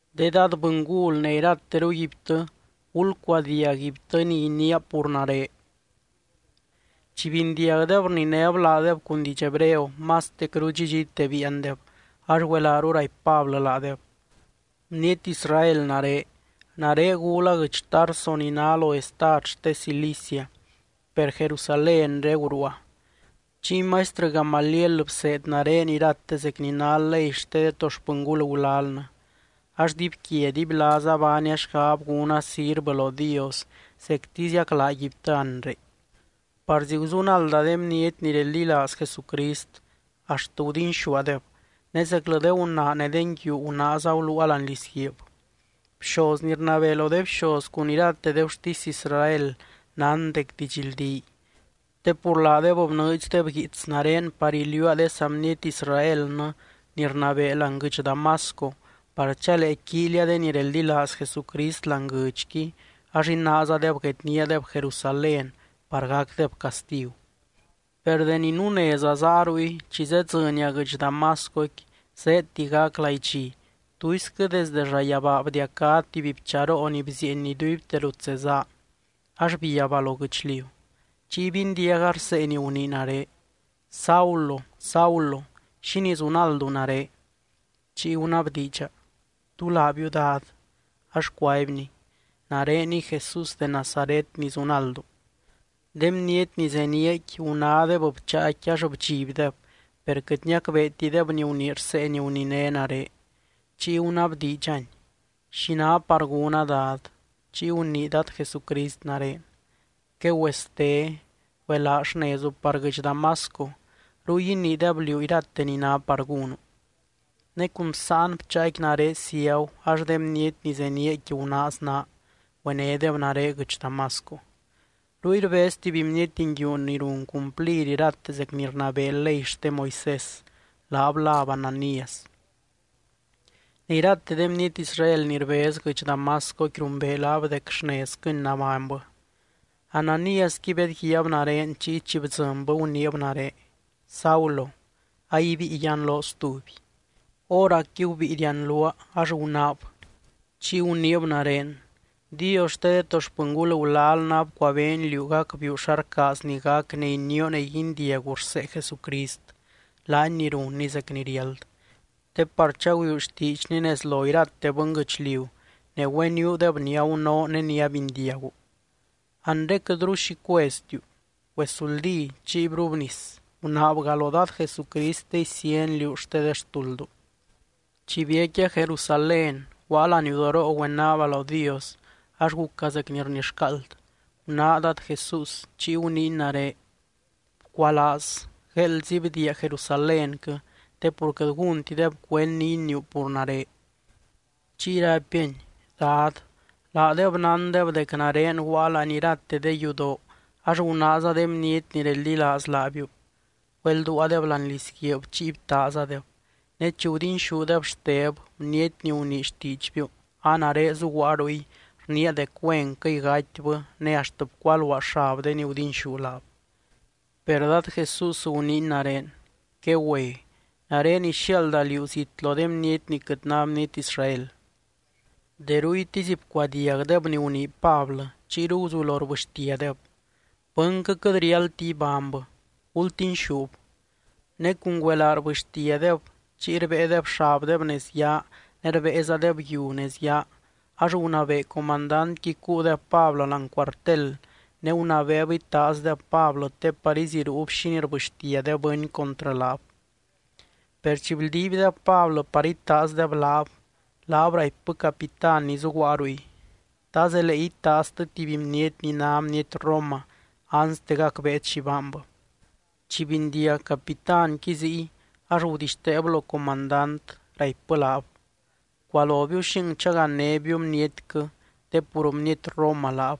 —De dad bɨngul ne irateruguibtɨ, gulcuadiag guibtɨ ni iniia pur nare. Chi bindiagdeb rninéb laadeb cun diidx hebreo, mastecru dxidxite biiandeb. Ax güelaaru raipy Pablɨ laadeb: —Bniety Israel nare. Nare gula guɨdx Tarso ni ná lo estad xte Cilicia, per Jerusalénre guruua. Chiy maistrɨ Gamaliel bseed nare irate zec ni ná ley xte de to xpɨngul gulalnɨ. Ax dibyquia dibylaaza baania xgab gúna sirvɨ lo Dios, zectiziac laaguibtɨ anre. Parzi guzunalda de bniety ni reldilaaz Jesucrist, axt gudinxúadeb, ne zeclɨ de gunaa ne de nguiu gunaaza guluua láani lizguiib. Bxoz ni rnabee lo de bxoz cun irate de gurtisy Israel nán dec didxldíy. Te pur laadeb bnɨɨdxdeb guiits nare par iliuua de saa bniety Israelnɨ ni rnabee láani guɨdx Damasco par chalee quíilia de ni reldilaaz Jesucrist láani guɨdxqui, ax inaazadeb guedníadeb Jerusalén par gacdeb castigu. ’Per deni nuneza záa ruy, chi zedzɨnia guɨdx Damascoqui zéedti gac laidxi, tuisquɨ desde llayabaa bdiacá tuby bcharoo ni bzieeny iduibte rut zezáa, ax biabba lo guɨchliu. Chiy bindiaga rsee ni gunii nare: “Saulo, Saulo, ¿xínii zunaldu nare?” Chiy gunabdiidxa: “¿Tú laabiu, Dad?” Ax cuaibny: “Nareniy Jesús de Nazaret ni zunaldu.” De bniety ni zeníaqui gunádeb bcháaqui ax bdxibdeb, per quɨt niacbeetideb ni gunii rsee ni guniné nare. Chiy gunabdiidxany: “¿Xi ná par gúna, Dad?” Chiy gunii Dad Jesucrist nare: “Quegüeste. Güelaa xnezu par guɨdx Damasco. Ruy iniideb liú irate ni ná par gúnu.” Ne cun bsáan bcháaqui nare ciagu, ax de bniety ni zeníaqui gunaaz naa, güenédeb nare guɨdx Damasco. ’Ruy rbez tuby bniety nguiu ni run cumplir irate zec ni rnabee ley xte Moisés, laab láb Ananías. Ne irate de bniety Israel ni rbez guɨdx Damascoqui rumbee laab dec xnezquɨny nabánybɨ. Ananíasqui bedguiaab nare, chiy chi bdzɨnbɨ guniib nare: “Saulo, aibíi yianloo stuby.” Hóracqui gubíi rianluaa, ax gunáab. Chiy guniib nare: “Dios xte de to xpɨngul gulalnɨ abcuabeeny liú gacbiiu xa rcaazny gac ne inioo ne guindiagu rsee Jesucrist, laany ni runny zec ni riáld. Te par chagüiuu xtiidxny nez lo irate bɨnguɨchliu, ne güeniuudeb ni agunoo ne ni abindiagu. Anre, quɨtru xi cueztiu. Güezuldí chiy brubnis, gunaabga lo Dad Jesucrist te isíany liú xte de xtuldu.” ’Chi biecquia Jerusalén, guaa laniudoroo güenaaba lo Dios, ax guca zec ni rnixcaald. Gunáa Dad Jesús, chiy guniiny nare: “Bcualaaz. Gueeldzi bdiia Jerusalénquɨ, te pur quɨt gúntideb cuend ni iniiu pur nare.” Chiy raipiany: “Dad, laadeb nándeb dec nare guaa láani irate de yudoo ax gunaaza de bniety ni reldilaaz laabiu, güelduaadeb láani lizguiib, chiy btaazadeb. Ne chi gudinxúdeb Xteb, bniety ni gunii xtiidxbiu, a nare zuguaa ruy, rniia dec güenquɨy gatybɨ, ne axt bcualuaa xab de ni gudinxú laab.” Per Dad Jesús guniiny nare: “Quegüe. Nare ixiaalda liú zit lo de bniety ni quɨt ná bniety Israel.” De ruytisy bcuadiagdeb ni gunii Pablɨ, chiyru guzulo rbɨxtiadeb: —¡Bɨnquɨ quɨt riáldti ibánybɨ! ¡Gultinxúb! Ne cun güelaa rbɨxtiadeb, chiy rbéedeb xabdeb nez yaa, ne rbéezadeb yiu nez yaa. Ax gunabee comandantqui cuudeb Pablɨ láani cuartel ne gunabeeb itaazdeb Pablɨ te par iziruub xínii rbɨxtia de bɨny contrɨ laab. Per chi bldiibdeb Pablɨ par itaazdeb laab, laab raipbɨ capitán ni zuguaa ruy: —¿Ta zelee itaaztɨ tuby bniety ni ná bniety Roma, anste gacbeet xi baanbɨ? Chi bindiag capitánqui ziy, ax güetixteeb lo comandant, raipbɨ laab: —Bcualobiu xing chagannébiu bnietquɨ, te pur bniety Roma laab.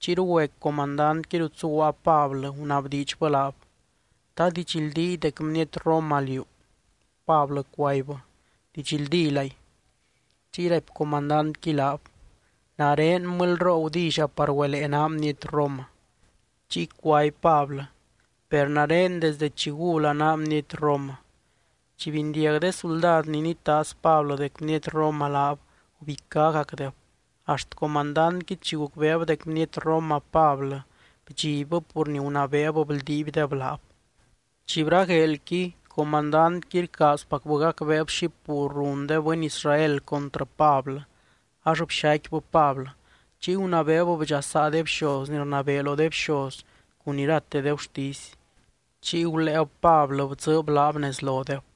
Chiyru güe comandantqui rut zuguaa Pablɨ, gunabdiidxbɨ laab: —¿Ta didxldíy dec bniety Roma liú? Pablɨ cuaibbɨ: —Didxldílay. Chiy raipy comandantqui laab: —Nare mɨlyroo gudilla par güelee naa bniety Roma. Chiy cuaby Pablɨ: —Per nare desde chi gula naa bniety Roma. Chi bindiag de suldad ni nitaaz Pablɨ dec bniety Roma laab, gubicágacdeb. Axt comandantqui chi gucbeeb dec bniety Roma Pablɨ, bdxibbɨ pur ni gunabeeb bldiibdeb laab. Chi bragueelqui, comandantqui rcaazpacbɨ gacbeeb xi pur run de bɨny Israel contrɨ Pablɨ. Ax bxaicquibɨ Pablɨ, chiy gunabeeb bdxasaa de bxoz ni rnabee lo de bxoz cun irate de gurtisy. Chiy guléeb Pablɨ bdzɨɨb laab nez lodeb.